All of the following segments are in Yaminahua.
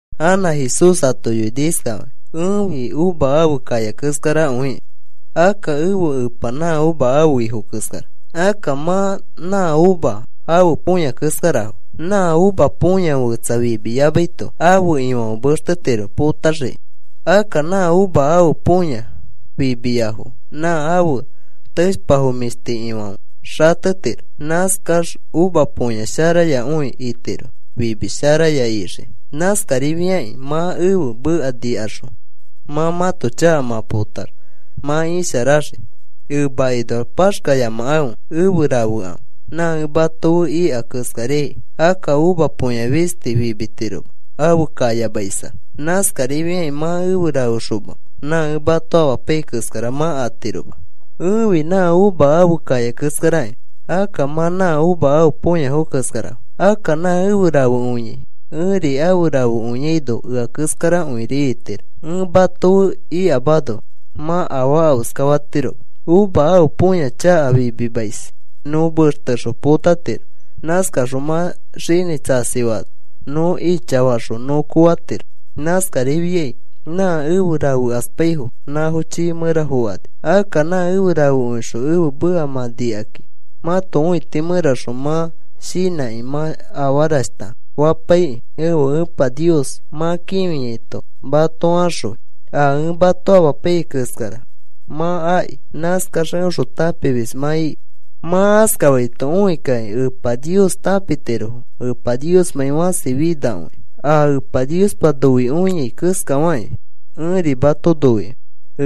Anã Jesús ato yoini iskafakĩ: “Ẽfi uva ãfe kaya keskarakõiki. Akka ẽfe Epa nã uva ãfe ifo keskara. Akka mã na uva ãfe põya keskarafo. Nã uva põya fetsa fimiyamaito ãfe ifãfe mextetiro potaxikĩ. Akka nã uva ãfe põya fimiyafo nã ãfe teshpa mĩshti ifãfe xatetiro. Nãskax uva põya sharayakõi itiro fimi sharaya ixikĩ. Nãskarifiakĩ mã ẽfe meka nikaxõ mã mãto chaka mã potax mã isharaxii. Emakinoax paxkayamakãfe. Efe rafekãfe, nã ẽ mato fe ika keskariai. Akka uva põya fisti fimitiroma ãfe kayamaisax. Nãskarifiakĩ mã efe rafexoma nã ẽ mato amapaiyai keskara mã atiroma. “Ẽfi nã uva ãfe kaya keskarakĩ. Akka mã na uva ãfe põyafo keskara. Akka nã efe rafekõiai ẽri afe rafekõiaino ea keskarakõiri itiro. Ẽ mato fe ikamano mã afaa afeskatiroma. Uva ãfe põya chaka fimimais nõ mextexõ potatiro. Nãskaxõ mã xinĩ tsasifaano nõ ichafaxõ nõ kofatiro. Nãskarifiai nã efe rafekaspaifo nãfo chiifã mẽra fokani. “Akka mã efe rafekõixõ ẽfe meka mã nikakĩ mãto õiti mẽraxõ mã shinãkĩ mã afarashta fapaikĩ ẽfe Epa Nios mã kĩfiaito mato axõi. A ẽ mato amapaiyai keskara mã akĩ nãskax eõxõ tãpimis mã iki. Mã askafaito õikakĩ Epa Nios tãpitirofo Epa Niosmãi fãsi finakõikẽ. A Epa Niospa noikõiai keskafakĩ ẽri mato noikõi.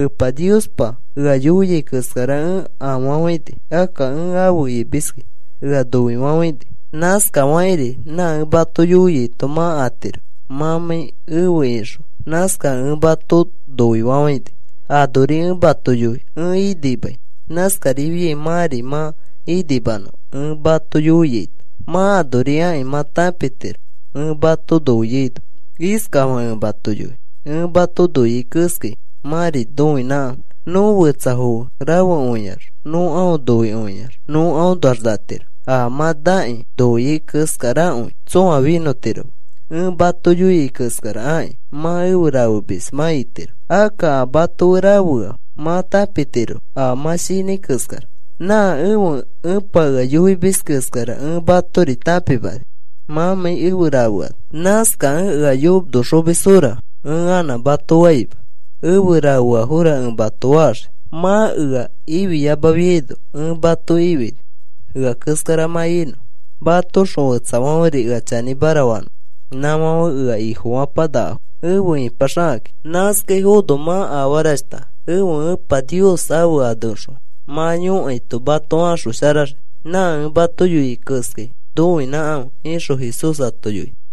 Epa Niospa ea yoiai keskara ẽ afafãini. Akka ẽ afe imiskẽ ea noifafãini. Nãskafakĩri nã ẽ mato yoiaito mã atiro mãmãi efe ixõ. Nãskakẽ ẽ mato noifafãini. “Anori ẽ mato yoi ẽ inimai. Nãskarifiai mãri mã inimanõ. Ẽ mato yoiaito mã anori akĩ mã tãpitiro ẽ mato noiaino. Iskafakĩ ẽ mato yoi: Ẽ mato noiai keskai mãri noinãkãfe. Nõ fetsafo fe rafekõiax nõ aõ noikõiax nõ aõnoax natiro. A mã nakĩ noiai keskarakõi tsõa finõtiroma. Ẽ mato yoiai keskara aki mã efe rafemis mã itiro. Akka a mato fe rafea mã tãpimatiro a mã shinãi keskara. Nã ẽfe Epa ea yoimis keskara ẽ matori tãpimani mãmãi efe rafeano. Nãskakẽ ea yonoxomisfora ẽ anã mato faima. Efe rafeafora ẽ mato faxii. Mã ea ifiyamafiaino ẽ mato ifini ea keskara mã inõ mãtoxõ fetsafãferi ea chanĩmara fanõfo. Nãfãfe ea Ifofapanakafo efe ipaxakakĩ. Nãskaifono mã afarashta ẽfe Epa Nios ẽfe aneõxõ mã yõkaito mato axosharaxii. Nã ẽ mato yoiai keskai noinãkãfe,” ixõ Jesús ato yoini.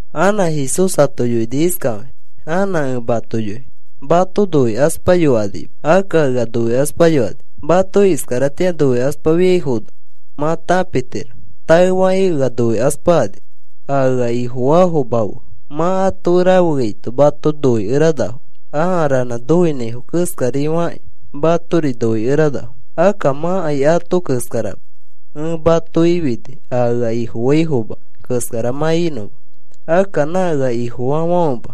Anã Jesús ato yoini iskafakĩ: “Anã ẽ mato yoi mato noikaspayokanima. Akka ea noikaspayokani. Mato iskaratĩa noikaspafiaifono mã tãpitiro taefakĩ ea noikaspakani. A ea Ifofaafoma fe mã ato fe rafeaito mato noikeranafo. Aa ranã noinãifo keskari fakĩ matori noikeranafo. Akka mãkai ato keskarama. Ẽ mato ifini a ea Ifofaifoma keskara mã inõma. Akka nã ea Ifofaafãfema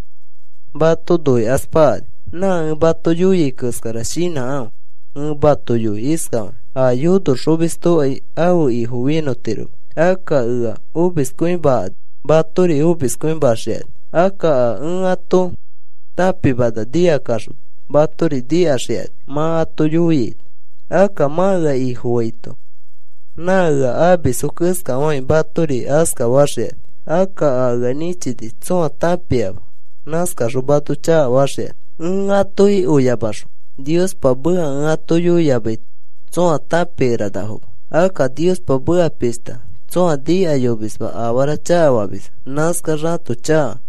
mato noikaspakani. Nã ẽ mato yoiai keskara shinãkãfe. Ẽ mato yoi iskafakĩ a yonoxomistokai ãfe ifo finõtiroma. Akka ea omiskõimakani matori omiskõimaxikani. Akka a ẽ ato tãpimana nikakaxõ matori nikaxikani mã ato yoiaito. Akka mã ea Ifofaito, nã ea amisfo keskafakakĩ matori askafaxikani. Akka a ea nĩchini tsõa tãpiama. Nãskaxõ mato chakafaxikani. “Ẽ atoki oyamaxõ Niospa meka ẽ ato yoiyamaito tsõa tãpikeranafoma. Akka Niospa meka pishta tsõa nikayomisma afara chakafamisfo. Nãskax ãto chaka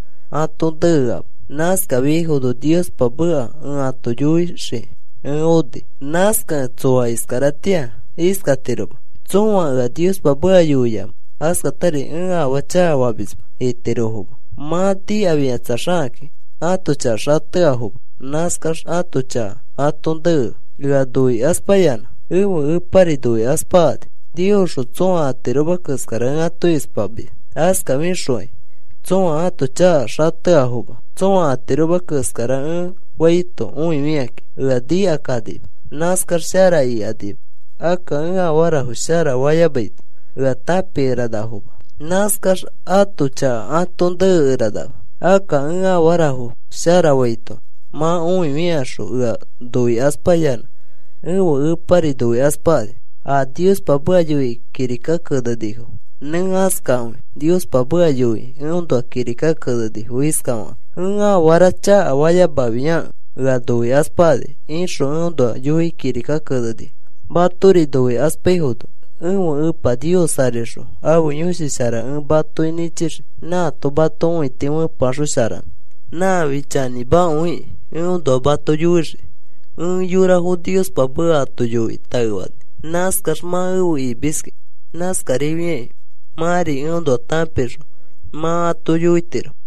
atoõ neama. Nãskafiaifono Niospa meka ẽ ato yoixiki ẽ oni. Nãskakẽ tsõa iskaratĩa iskatiroma: ‘Tsõa ea Niospa meka yoiama.’ Askatari: ‘Ẽ afaa chakafamisma,’ itirofoma. Mã nikafikatsaxakakĩ ãto chaka xateafoma. Nãskax ãto chaka atoõ nea. Ea noikaspayanã ẽfe Epari noikaspakani. Niosxõ tsõa atiroma keskara ẽ ato ispamis. Askafikaxokai tsõa ãto chaka xateafoma. Tsõa atiroma keskara ẽ faito õifikakĩ ea nikakanima. Nãskax shara ikanima. Akka ẽ afarafo shara fayamaito ea tãpikeranafoma. Nãskax ato chaka atoõ nekeranama. Akka ẽ afarafo shara faito mã õifikaxõ ea noikaspayanã ẽfe Epari noikaspakani. A Niospa meka yoikĩ kirika kenenifo nẽ askakõi. Niospa meka yoikĩ eõnoa kirika kenenifo iskafakakĩ: ‘Ẽ afara chakafayamafiakẽ ea noikaspakani,’ ixõ eõnoa yoikĩ kirika kenenifo. “Matori noikaspaifono ẽfe Epa Nios arixõ ãfe Yõshi Shara ẽ matoki nĩchixii. Nãato mato õiti fepeaxosharanõ. Nãfi chanĩmakõikĩ eõnoa mato yoixii. Ẽ yorafo Niospa meka ato yoikĩ taefani. Nãskax mã efe imiski. Nãskarifiakĩ mãri eõnoa tãpixõ mã ato yoitiro.